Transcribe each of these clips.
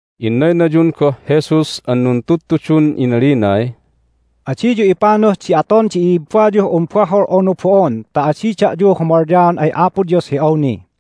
Innaynayun goh Jesus an nuntudtudun inalinay, "Adiyu ipanuh di aton di i'ibbayuh un bahol unu bo'on ta adi da'yu humalyaon ay Apo Dios hi awni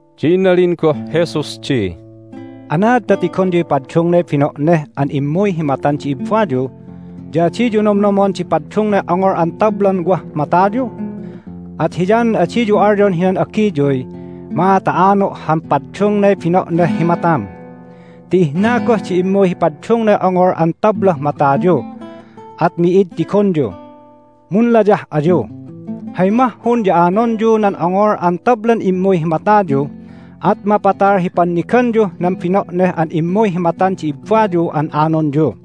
Ya inalin goh Jesus di, "Anaad ta tigonyuy paddungnay bino'neh an immuy hi matan di ibbayu, ya adiyu nomnomon di paddungnay ongol an tablan wah matayu? At hiyanan adiyu alyon hinan agiyuy, Ma'a ta ano' han paddungnay bino'neh hi matam! Ti ihna goh di immuy hi paddungnay ongol an tablah matayu, at mi'id tigonyu! Munlayah ayu! Hay mahhun ya anonyu nan ongol an tablan immuy hi matayu, at mapatal hi panniganyuh nan bino'neh an immuy hi matan di ibbayu an anonyu.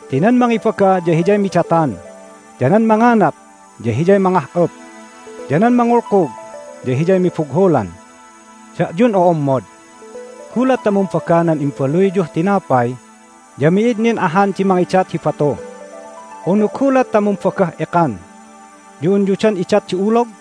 Ti nan mangibaga ya hiyay midatan, ya nan manganap ya hiyay mangah'up, ya nan mangulkug ya hiyay mibughulan. Da'yun o'ommod, gulat ta mumbaga nan imbaluyyuh tinapay ya mi'id nin ahan di mangidat hi batu! Unu gulat ta mumbagah ekan ya unyu dan idat di ulog?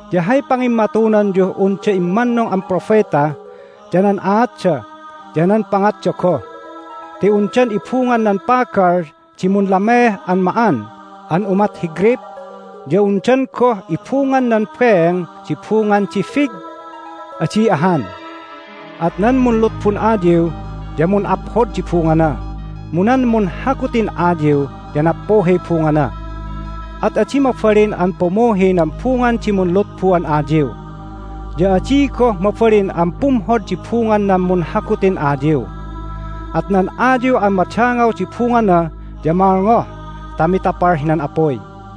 Ya hay pangimmatunanyuh unda immannung an propeta ya nan aatda ya nan pangatda goh. Ti undan ibungan nan pagal di munlameeh an ma'an an umat hi greyp, ya undan goh ibungan nan beeng di bungan di fig? Adi ahan! At nan munlutbun ayiw ya mun'aphod di bungana, mu nan munhagutin ayiw ya nappuhiy bungana. At adi mabalin an pumuhi nan bungan di munlutbu an ayiw, ya adi goh mabalin an pumhod di bungan nan munhagutin ayiw. At nan ayiw an madangaw di bungana ya malngoh ta mitapal hinan apuy.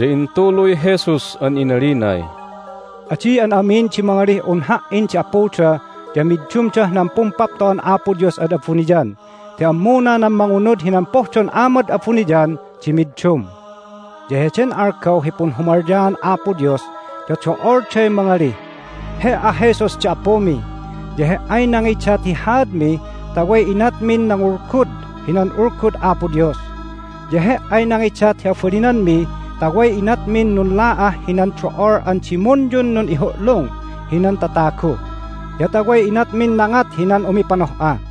Ya intuluy Jesus an inalinay, "Adi an amin di mangalih un Ha"in di Apuda ya middumdah nan Pumpapto'an Apo Dios ad abuniyan ti ammuna nan mangunud hinan pohdon Amad abuniyan di middum. Ya heden algaw hi punhumalyaan Apo Dios ya do'olday mangalih, He"a Jesus di Apumi, ya He"ay nangidat hi haadmi ta way inatmin nangulgud hinan Ulgud Apo Dios! Ya He"ay nangidat hi abalinanmi ta way inatmin nunla'ah hinan do'ol an dimunyun nun'ihu'lung hinan tatagu, ya ta way inatmin nangat hinan umipanoh'a!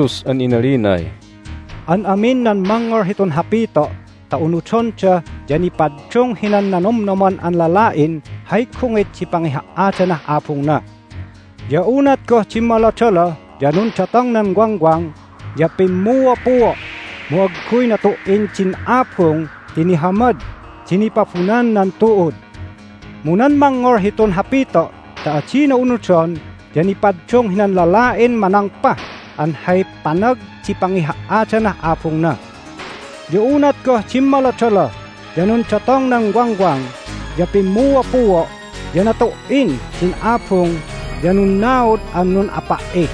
Ya intuluy Jesus an inalinay, "An amin nan mangngol hitun hapito' ta unudonda ya nipaddung hinan nanomnoman an lala'in hay gungit di pangiha"adanah abungna. Ya unat goh dimmolodoloh, ya nundatong nan wangwang, ya pimmuopuo', mu agguy natu"in din abung ti nihamad di nipabunan nan tu'ud. Mu nan mangngol hitun hapito' ta adina unudon ya nipaddung hinan lala'in manangpah an hay panag di pangiha"adanah abungna. Ya unat goh dimmolodoloh, ya nundatong nan wangwang, ya pimmuopuo', ya natu"in din abung ya nunnaud an nun'apa"i!"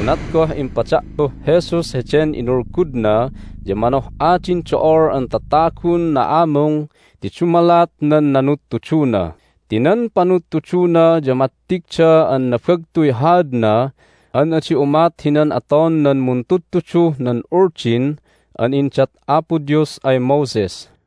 Unat goh impada'puh Jesus heden inulgudna ya manoh'a din do'ol an tatagun na'amung ti dumalat nan nanudtuduna ti nan panudtuduna ya mattigda an nabagtuy haadna an adi umat hinan aton nan muntudtuduh nan Uldin an indat Apo Dios ay Moses.